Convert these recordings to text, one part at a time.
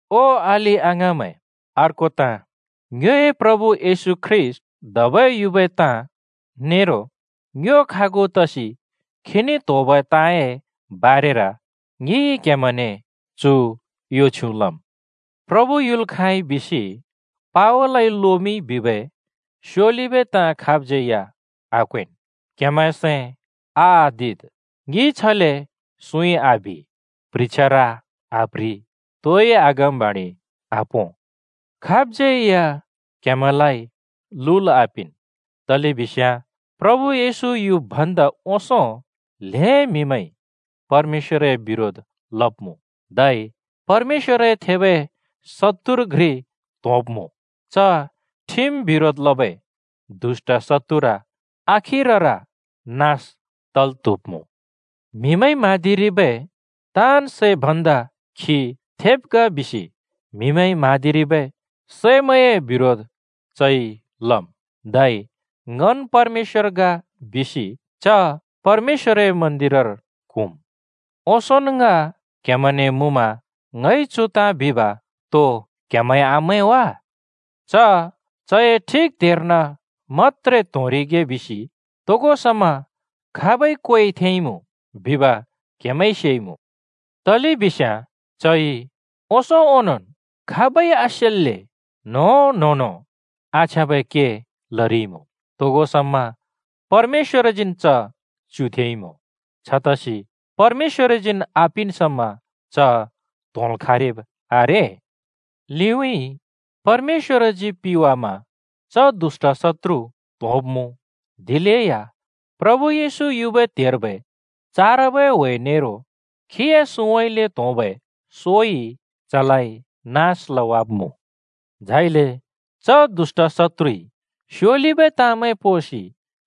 ओ अलि-अङाँमैं, अर्को ताँ, ङ्योए प्रभु येशू ख्रीष्‍ट धबै युबै ताँ नेरो ङ्यो खागु तसि खीने त्होबै ताँए बारेर ङिइ क्‍हेमैंने चु यो छ्युँ लम्: “प्रभु युल् खाँइ बिसि पावलइ लोमिंइ,” बिबै स्योलिबै ताँ खाबज्यै या आक्वेंन्, क्‍हेमैंए सैं आआदिद्। ङिइ छले सुँइ आबि, प्ह्रिछ्यार आप्ह्रि, तोइ अगमबाणि आपों। खाबज्‍यै या क्‍हेमैंलाइ लुल् आपिंन्, तलेबिस्याँ प्रभु येशू युब् भन्‍दा ओंसों ल्‍हें म्‍हिमैंइ परमेश्‍वरए बिरोध लब्मुँ, धै परमेश्‍वरए थेबै शत्तुर घ्रि त्‍होंब्‍मु। च ठिम बिरोध लबै दुष्‍ट शत्तुर आखिरर नास तल् त्‍हुब्‍मु। म्हिमैंइ म्हाँदिरिबै ताँन् सैमैं भन्दा खी थेब् ग बिसि म्हिमैंइ म्हाँदिरिबै सैमैंए बिरोध चइ लम्। धै ङन् परमेश्‍वर ग बिसि च परमेश्‍वरए मन्‍दिरर क्हुँम्। ओंसोंन ङ क्‍हेमैंने मुँमा ङइ चु ताँ बिब तो क्हेमैंइ आमैं वा? च चए ठिक त्हेर्न मत्‍त्रे त्होंरिगे बिसि तोगो समा खाबइ क्वेइ थेंइमुँ बिब क्हेमैंइ सेइमुँ। तलेबिस्याँ चइ ओंसों ओंनोंन् खाबइ आसेल्‍ले न्हों-न्होंनो आछ्याँबै के लरिइमुँ। तोगो समा परमेश्‍वरजीन् च च्युथेंइमुँ, छतसि परमेश्‍वरजीन् आपिन् समा च त्होंल् खाँरिब् आरे। लिउँइँ परमेश्‍वरजी पिवासि च दुष्‍ट शत्‍त्रु त्‍होंब्मुँ, दिलेया प्रभु येशू युबै त्हेर्बै चारबै ह्‍वे नेरो खीए सुँउँइँले त्होंबै सोइ चलाइ नास लवाब्‍मुँ। झाइले च दुष्‍ट शत्‍त्रुइ स्योलिबै ताँमैं पोंसि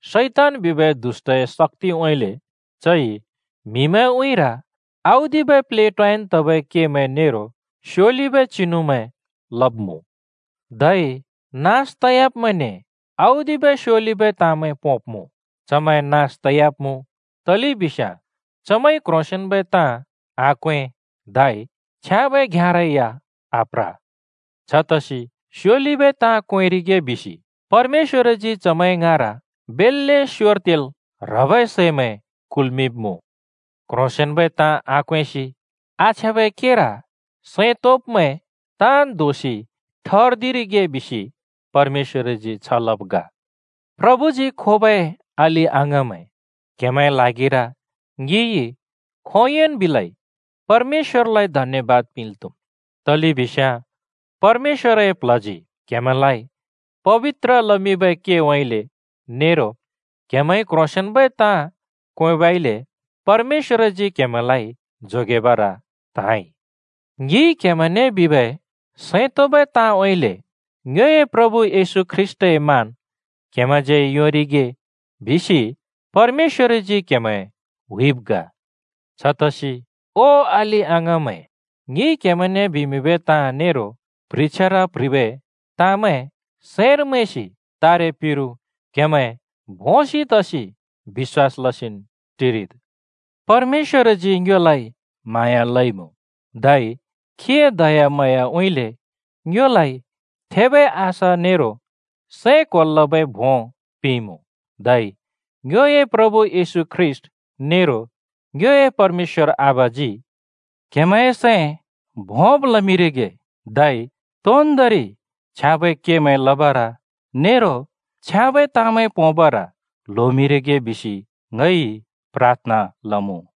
शैतान बिबै दुष्‍टए शक्‍तिउँइँले चइ म्हिमैंए उँइँर औदिबै प्लेटोयान् तबै केमैं नेरो स्योलिबै चिनुमैं लब्‍मुँ। धै नास तयाब्मैंने औदिबै स्योलिबै ताँमैं पोंब्मुँ। चमैं नास तयाब्मुँ तलेबिस्याँ चमैंइ क्ह्रोंसेंन्बै ताँ आक्वें धै छ्याँबै घ्याँरै या आप्र। छतसि स्योलिबै ताँ क्वेंरिगे बिसि परमेश्‍वरजी चमैंए ङाँर बेल्‍ले स्योर तेल् ह्रबै सैमैं कल्मिंब्मुँ। क्ह्रोंसेंन्बै ताँ आक्वेंसि आछ्याँबै केर सैं तोंब्मैं ताँन् दोषि ठर्दिरिगे बिसि परमेश्‍वरजी छ लब् ग। प्रभुजी खोबै अलि-अङाँमैं, क्‍हेमैंए ल्हागिर ङिइ खोंयोंन् बिलै परमेश्‍वरलाइ धन्‍यबाद पिंल् त्हुम्, तलेबिस्याँ परमेश्‍वरए प्ल्हजी क्हेमैंलाइ पबित्र लमिंबै केउँइँले नेरो क्हेमैंइ क्ह्रोंसेंन्बै ताँ क्वेंबइले परमेश्‍वरजी क्‍हेमैंलाइ जोगेबर त्हाँइ। ङिइ क्हेमैंने बिबै सैं तोंबै ताँउँइँले ङ्योए प्रभु येशू ख्रीष्‍टए मान क्हेमैंज्यै या योंरिगे बिसि परमेश्‍वरजी क्हेमैं हुइब् ग। छतसि, ओ अलि-अङाँमैं, ङिइ क्‍हेमैंने बिमिंबै ताँ नेरो प्ह्रिछ्यार प्‍ह्रिबै ताँमैं सैंर मैंसि तारे पिरु क्हेमैं भोंसि तसि बिश्‍वास लसिन् टिरिद्। परमेश्‍वरजी ङ्योलाइ म्हाँया लइमुँ धै खीए दयाम्हाँयाउँइँले ङ्योलाइ थेबै आशा नेरो सैं क्होल् लबै भों पिंइमुँ। धै ङ्योए प्रभु येशू ख्रीष्‍ट नेरो ङ्योए परमेश्‍वर आबाजी क्‍हेमैंए सैं भोंब लमिंरिगे धै तोन्‍दोंरि छ्याँबै केमैं लबर नेरो छ्याँबै ताँमैं पोंबर ल्होमिंरिगे बिसि ङइ प्राथना लमुँ।